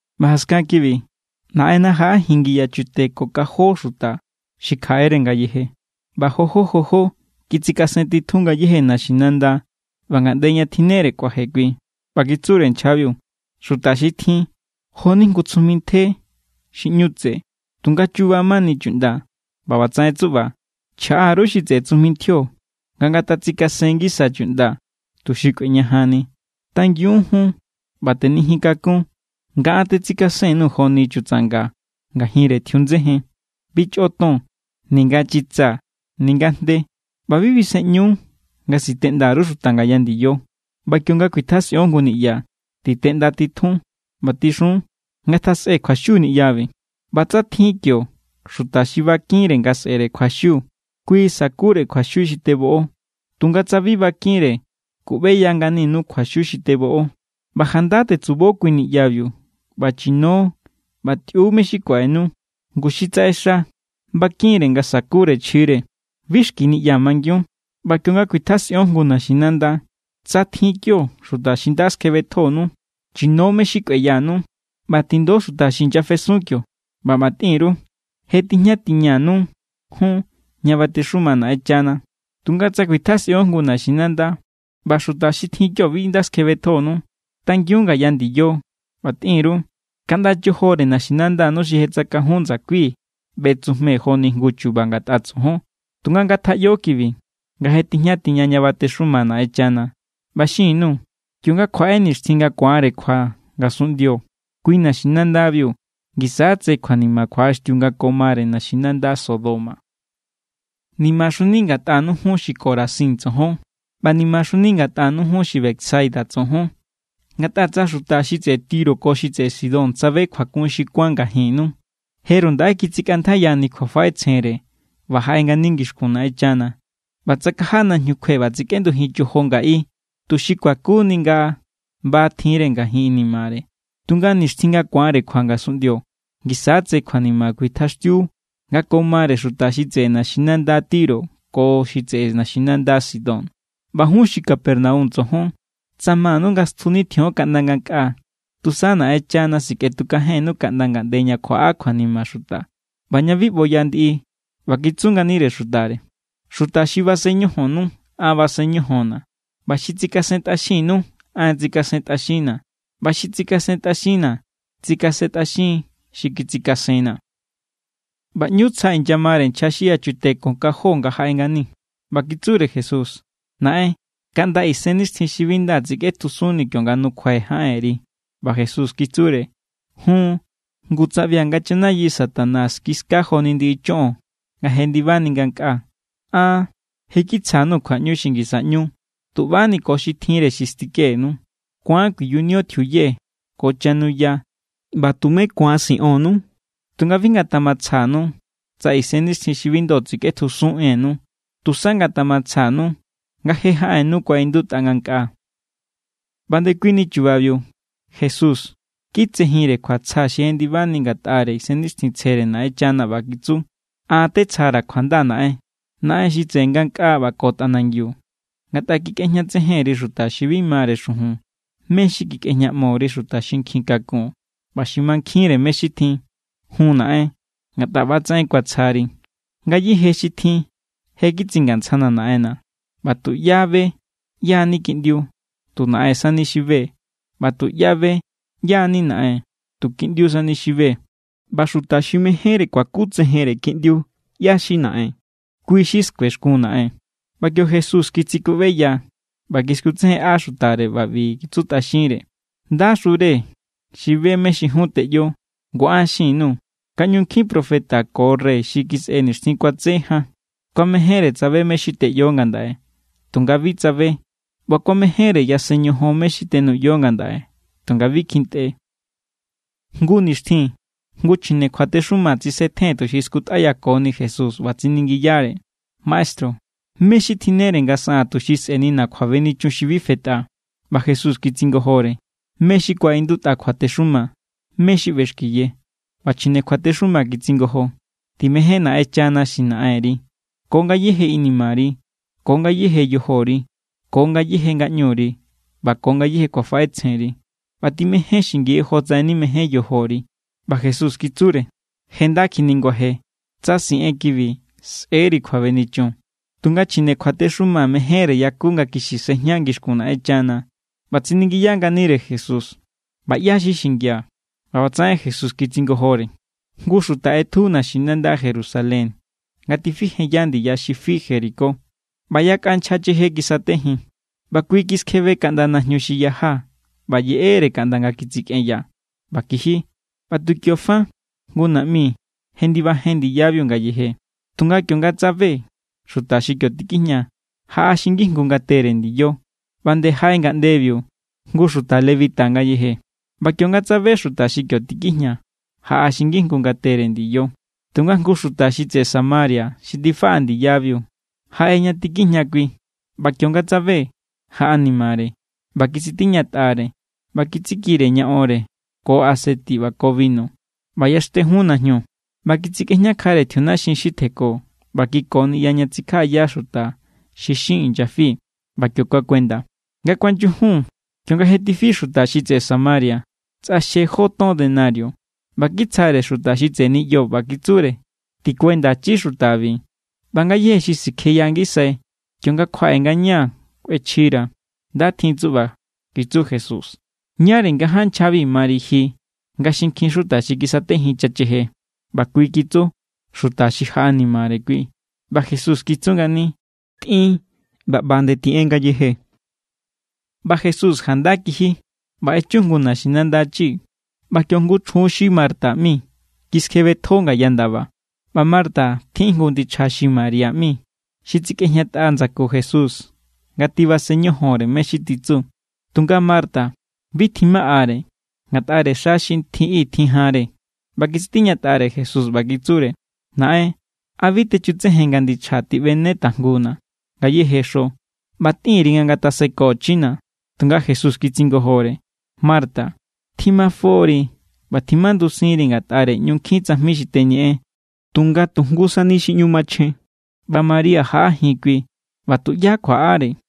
ꞌBa jaskan kibi, Naꞌenna jaꞌajin ngiyachute ko kan jó xuta xi kjaꞌere ngayeje, ꞌba jojó jojó kitsikasentitjun ngayéje naxinanda ꞌba ngaꞌnde ña tjinnere kuaje kui. ꞌBa kitsure nchjabiu: —Xuta xi tjin, jo=ni jngu tsujmi ntje xi ꞌñu tse, tunga chuba mani chuꞌnda. ꞌBa ꞌbatsaꞌen tsuꞌba chjaꞌa_ru xi tseꞌe tsujmi ntjio, nga ngatatsikasen ngisa chuꞌnda tuxi kꞌueñajanni. Tangiun jun ꞌba tenijin kakun nga an tetsikasen_nuu̱ joni chutsanga ngajinre tjiundsejen. Bi chꞌo ton, ninga chitsa, ninga jnde. ꞌBa bi bisenꞌñu nga siteꞌnda_ru xuta ngaya ndiyo. ꞌBa kionga kuitjasꞌion jngu niꞌya, titeꞌndatitjun ꞌba tixun: “Ngatjasꞌe kjuaxiu niꞌyabi.” ꞌBa tsa tjin kio xuta xi bakinre nga sꞌe̱re kjuaxiu, kui sakure kjuaxiu xi teboꞌo. Tunga tsa bi bakinre, kuꞌbeya nganinu kjuaxiu xi teboꞌo. ꞌBa janda tetsubo kui niꞌyabiu, ꞌba chino ꞌba tꞌiu mé= xi kuaꞌenu. Ngu xi tsaꞌexa bakin=re̱ nga sakure chjire. Bi xki niꞌya mangiun. ꞌBa kionga kuitjasꞌion jngu naxinanda, tsa tjin kio xuta xi nda skjebetjonu, chino mé= xi kꞌueyanu. ꞌBa tindo xuta xi inyafesun kio ꞌba ꞌba tꞌin_ru: “Je tijña tiñanu jun ña batexuma Naꞌenchana.” Tunga tsa kuitjasꞌion jngu naxinanda ꞌba xuta xi tjin kio bi nda skjebetjonu, tangiun ngaya ndiyo ꞌba tꞌin_ru: “Kaꞌnda chojore naxinandanu xi je tsakajun ndsakui̱, ꞌbetsujmee̱ joni jngu chu̱ba̱ ngatꞌa tsojon. Tunga ngatjaꞌyo kibi, nga je tijña tiña ña batexuma Naꞌenchana.” ꞌBa xin_nuu̱. Kionga kjuaꞌe nixtjin nga ku̱anre kjua ngasunꞌndio, kui naxinandabiu ngisa= tse kjuanima kjuaꞌaxtiu nga ko mare naxinanda Sodoma. ’¡Nimaxuni ngatꞌanu jun, xi Corazín tsojon! ¡ꞌBa nimaxuni ngatꞌanu jun, xi Betsaida tsojon! Ngatꞌa tsa xuta xi tseꞌe Tiro ko xi tseꞌe Sidón tsabe kjuakun xi kuán ngajinnu, jeru ndaꞌe kitsikꞌantjaiyani kjuafaꞌetsjenre ꞌba jaꞌe ngani ngixkun Naꞌenchana. ꞌBa tsakaja najñu kjue ꞌba tsikꞌendujin chojo ngaꞌi tuxi kuakuni nga ba tjinre ngajin inimare. Tunga nixtjin nga ku̱anre kjua ngasunꞌndio, ngisa= tse kjuanima kuitjaxtiu nga ko mare xuta xi tseꞌe naxinanda Tiro ko xi tseꞌe naxinanda Sidón. ꞌBa jun xi Capernaum tsojon, tsa manu nga stjunitjion kaꞌnda ngankꞌaa, tusa Naꞌenchana sikꞌetukajennu kaꞌnda ngaꞌnde ña kjuaꞌa kjuanima xuta ꞌba ña bi ꞌboya ndiꞌi. ꞌBa kitsu nganire xutare: —Xuta xi basen ñojonnu, an basen ñojonna̱. ꞌBa xi tsikasentꞌaxinnu, an tsikasentꞌaxinna̱. ꞌBa xi tsikasentꞌaxinna̱, tsikasentꞌaxiin xi kitsikasenna̱. ꞌBa ꞌñu tsja inyamare nchja xi yachute ko kan jó nga jaꞌe ngani. ꞌBa kitsure Jesús: —Naꞌen, kaꞌnda isennixtjin xi bi nda tsikꞌetjusunni̱ kionga nukjuai̱ jaꞌenri. ꞌBa Jesús kitsure: —Jun. Ngu tsaꞌbia̱ nga chanayi Satanás kiska joni ndiꞌi choꞌon nga jendibani ngankꞌaa. An je kitsjanu kjuaꞌñu xi ngisa ꞌñu tu ꞌbani ko xi tjinre xi stikenu. Ku̱an kuiyunio tjiuye ko chanuya, ꞌba tumé ku̱an siꞌonnu. Tunga bi ngatjamatsjanu tsa isennixtjin xi bi ndo tsikꞌetjusun ennu. Tusa ngatjamatsjanu nga je jaꞌennu kuaꞌindutꞌa ngankꞌaa. ꞌBa ndekuini chubabiu Jesús kitsejinre kjuatsja xi jendibani ngatꞌare Isennixtjintsjere Naꞌenchana ꞌba kitsu: —An tetsjara̱ kjuanda, Naꞌen, Naꞌen xi tseꞌe ngankꞌaa ꞌba ko tꞌanangiu. Ngatꞌa kikꞌejñatsejen_ri xuta xi bi mare xujun mé= xi kikꞌejñaꞌmo_ri xuta nkjin kakun ꞌba xi mankjinre mé= xi tjin. Jun, Naꞌen, ngatꞌa ꞌba=tsaꞌen kuatsjari. ’Ngayéje xi tjin je kitsingantsjana̱ Naꞌenna̱. ꞌBa tuꞌyá be ꞌyá= ni Kiꞌndiu, tu Naꞌen sani xi be. ꞌBa tuꞌyá be ꞌyá= ni Naꞌen, tu Kiꞌndiu sani xi be. ꞌBa xuta xi mejénre kuakutsejenre Kiꞌndiu ꞌyá= xi Naꞌen, kui= xi skuexkun Naꞌen. ꞌBa kio Jesús kitsikuꞌbeya ꞌba kiskutsejenꞌa xutare ꞌba ꞌbi kitsutꞌaxinre: —Ndaxure xi be mé= xi jun teꞌyo. Ngu an xin_nuu̱ nga ꞌñu nkjin profeta ko rey xi kisꞌe nixtjin kuatse jan kuamejénre tsabe mé= xi teꞌyo ngandaꞌe, tunga bi tsabe. ꞌBa kuamejénre yasen ñojon mé= xi tenuꞌyo ngandaꞌe, tunga bi kjintꞌe. Jngu nixtjin jngu chjine kjuatexuma tsisetjen tuxi skutꞌayakoni Jesús, ꞌba tsiningiyare: —Maestru, ¿mé= xi tjinnere nga saꞌaa̱n tuxi sꞌe̱nina̱ kjuabenichun xi bi fetꞌa? ꞌBa Jesús kitsingojore: —¿Mé= xi kuaꞌindutꞌa kjuatexuma? ¿Mé= xi ꞌbexkiye? ꞌBa chjine kjuatexuma kitsingojo: —“Timején Naꞌenchana xi Naꞌenri ko ngayéje inimari, ko ngayéje yojori, ko ngayéje ngaꞌñuri ꞌba ko ngayéje kjuafaꞌetsjenri.” ꞌBa: “Timején xingi jotsaꞌen nimején yojori.” ꞌBa Jesús kitsure: —Je nda kjiniguaje. Tsa siꞌen kibi, sꞌe̱=ri kjuabenichun. Tunga chjine kjuatexuma mejénre yaku nga kixi sejña ngixkun Naꞌenchana, ꞌba tsiningiya nganire Jesús: —ꞌBa ¿ꞌyá= xi xingia̱? ꞌBa ꞌbatsaꞌen Jesús kitsingojore: —Jngu xuta ꞌetju naxinanda Jerusalén nga tifijenya ndiya xi fi Jericó. ꞌBa yakꞌa nchja cheje kisatejin, ꞌba kui kiskjebe kaꞌnda najñu xi yaja ꞌba yeꞌere kaꞌnda nga kitsikꞌenya, ꞌba kiji. ꞌBa tu kio fa, jngu naꞌmi jendibajen ndiyabiu ngayeje, tunga kionga tsabe xuta xi kio tikijña, jaꞌa xi ngijngu ngatere ndiyo. ꞌBa nde jaꞌe ngaꞌndebiu jngu xuta levita ngayeje. ꞌBa kionga tsabe xuta xi kio tikijña, jaꞌa xi ngijngu ngatere ndiyo. Tunga jngu xuta xi tseꞌe Samaria xi tifaꞌa ndiyabiu jaꞌe ña tikijña kui, ꞌba kionga tsabe, jaꞌanimare. ꞌBa kitsitiñatꞌare ꞌba kitsikire ña onre ko aseti ꞌba ko binu, ꞌba yaxtejun najñu. ꞌBa kitsikꞌejñakjare tjiunaxin xi tjenko ꞌba kiko niꞌya ña tsikjaꞌaya xuta xi xin inyafi, ꞌba kio kuakuenda. Nga kuanyujun, kionga je tifi xuta xi tseꞌe Samaria, tsꞌaxje jó ton denario ꞌba kitsjare xuta xi tseꞌe niꞌyo, ꞌba kitsure: “Tikuendachi xutabi. ꞌBa ngayéje xi sikjeya ngisai, kionga kjuaꞌe ngañaa̱ kꞌuechjira̱.” Nda tjin tsuꞌba —kitsu Jesús—. ¿Ñáre ngaján nchjabi mari ji nga xinkjin xuta xi kisatejin chacheje? ꞌBa kui kitsu: —Xuta xi jaꞌanimare kui. ꞌBa Jesús kitsu ngani: —Tꞌin ꞌba ꞌba nde tiꞌen ngayeje. ꞌBa Jesús janda kiji ꞌba echu jngu naxinanda chi. ꞌBa kio jngu chjun xi Marta ꞌmi kiskjebetjo ngaya ndaba. ꞌBa Marta tjin jngu ndichja xi María ꞌmi, xi tsikꞌejñatꞌa ndsaku Jesús nga tibasen ñojonre mé= xi titsu. Tunga Marta, bi tjimaꞌare ngatꞌare xa xi tjin i tjin janre. ꞌBa kitsitiñatꞌare Jesús, ꞌba kitsure: —Naꞌen, ¿a bi techutsejen nga ndichjaa̱ tiꞌbene tajnguna̱ ngayéje xo? ꞌBa tꞌin_ri nga ngatasekochina̱. Tunga Jesús kitsingojore: —Marta, tjimafo=ri ꞌba tjimandusinri ngatꞌare ꞌñu nkjin tsajmi xi teñeꞌen. Tunga tu jngu sani xi ꞌñu machjen, ꞌba María jaꞌajin kui, ꞌba tuꞌyá kjuaꞌare.